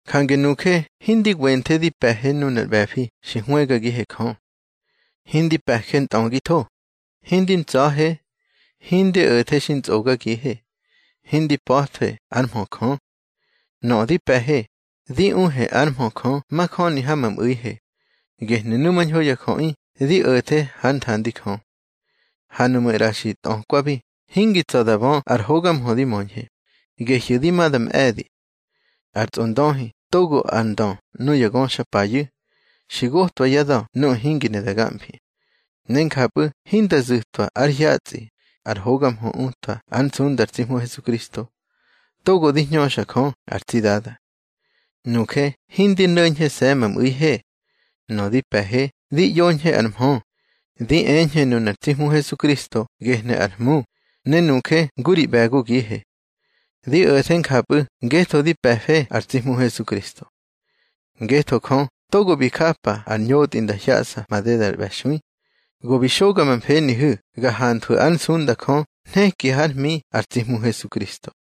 Jange nuje hindi wenthe di pe̱he nunar ꞌbe̱fi xi hwëgagihe Jö. Hindi mpe̱je ntꞌögitho, hindi ntsa̱je. Hindi o̱the xi ntsꞌogagihe, hindi pa̱thwe ár mhö Jö. Nöꞌö di pe̱he, di uhe ár mhö Jö majöni ha ma mꞌu̱ihe, gehnu̱ numañho ya jöꞌi di o̱the hár nthandi Jö. Ha nuꞌmu̱ ꞌra xi tꞌökwabi, hingi tsa̱ da bö ar hoga mhö di möñhe, gehyu̱ di ma da mꞌe̱di. Ar tsꞌondöhi togo ar ndö nuya ngöxapayu̱, xi gotꞌwa yá da̱ nuꞌu̱ hingi ne da gamfi. Ne njapꞌu̱ hinda zu̱twa ár hyatsꞌi ar hoga mhö utwa ár nsunda ar tsi Hmu Hesukristo, togo di hñöxa Jö ar tsi Dada. Nuje hindi no̱ñhese̱ ma mꞌu̱ihe. Nöꞌö di pe̱he, di ꞌyoñhe ar mhö, di eñhe nunar tsi Hmu Hesukristo gehnu̱ ar Hmu, ne nuje ngu ri ꞌbe̱gogihe. Di o̱the njapꞌu̱ ngetho di pe̱fe ar tsi Hmu Hesukristo. Ngetho Jö togo bi japa ar ñotꞌi nda hyaꞌsa madedar ꞌbe̱xui, go bi xoga ma mfenihu̱ ga hanthwu̱ ár nsunda Jö nheki hár hmi ar tsi Hmu Hesukristo.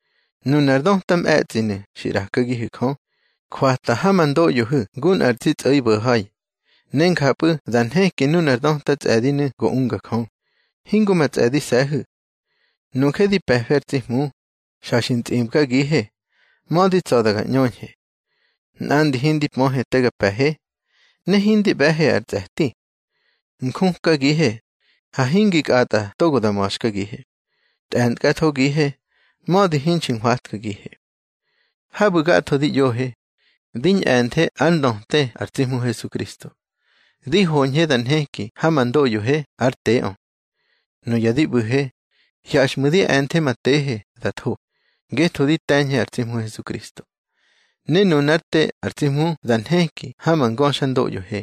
Nunar döta mꞌe̱tsꞌinu̱ xi ꞌrakagihu̱ Jö, jwata ha ma ndoꞌyohu̱ ngu nꞌar tsi tsꞌo̱ibo̱ha̱i. Ne njapꞌu̱ da nheki nunar döta tsꞌe̱dinu̱ go unga Jö, hingo ma tsꞌe̱dise̱hu̱. Nuje di pe̱fe ar tsi Hmu, xa xi ntsꞌibgagihe, mödi tsa̱da ga ꞌñöñhe. Nꞌandi hindi pöhe te ga pe̱he, ne hindi ꞌbe̱he ar tsꞌe̱ti. Njukagihe, ha hingi kꞌatꞌa togo da ma̱xkagihe. Tꞌe̱ntkꞌathogihe, mödi hinxi nhwatkagihe. Habu̱ gatho di ꞌyohe, di ñꞌe̱nthe ár ndöte ar tsi Hmu Hesukristo, di hoñhe da nheki ha ma ndoꞌyohe ár teꞌö. Nuya di ꞌbu̱he, hyaxꞌmu̱ di e̱nthe ma tehe da tho, ngetho di te̱ñhe ar tsi Hmu Hesukristo. Ne nunár te ar tsi Hmu da nheki ha ma ngöxandoꞌyohe.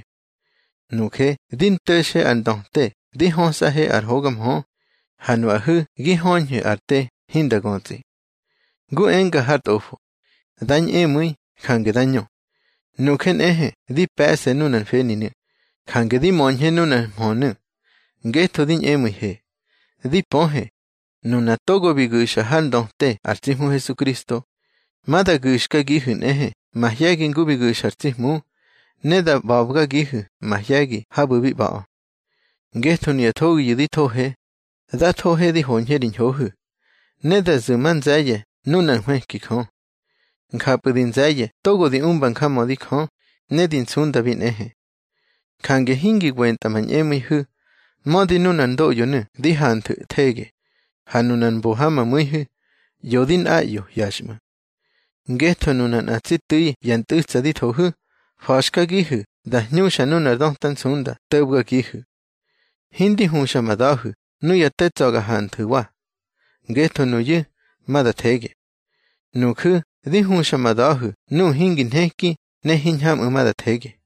Nuje di nto̱xe ar ndöte di hösꞌahe ar hoga mhö, ha nuꞌahu̱ gi höñhu̱ ar te hinda götsꞌi. Ngu enga har Tꞌofo: Da ñꞌemu̱i, jange da ñö. Nuje nꞌehe di pe̱ꞌse nunar mfeninu̱, jange di möñhe nunar mhönu̱, ngetho di ñꞌemu̱ihe. Di pöhe, nuna togo bi gu̱xa har ndöte ar tsi Hmu Hesukristo, ma da gu̱xkagihu̱ nꞌehe mahye̱gi ngu bi gu̱xa ar tsi Hmu, ne da ꞌba̱bgagihu̱ mahye̱gi habu̱ bi ꞌba̱ꞌö. Ngetho nuya thogiyu̱ di thohe, da thohe di hoñhe ri ñhohu̱, ne da zu̱ ma nze̱ye̱ nunár nhwëki Jö. Njapꞌu̱ di nze̱ye̱ togo di umba njamödi Jö, ne di nsundabi nꞌehe. Jange hingi wentꞌa ma ñꞌemu̱ihu̱. Mödi nunar ndoꞌyonu̱ di hanthu̱ thege, ha nunu̱ mbo ha ma mu̱ihu̱, ꞌyo di nꞌaꞌyo hyaxꞌmu̱. Ngetho nuna nꞌa tsi tu̱i ya ntꞌu̱tsa di thohu̱, fa̱xkagihu̱ da hñuxa nunar döta nsunda to̱bgagihu̱. Hindi huxa ma da̱hu̱ nuya te tsa̱ ga hanthu̱wa, ngetho nuyu̱ ma da thege. Nuju̱ di huxa ma da̱hu̱ nuꞌu̱ hingi nheki ne hiñhamꞌu̱ ma da thege.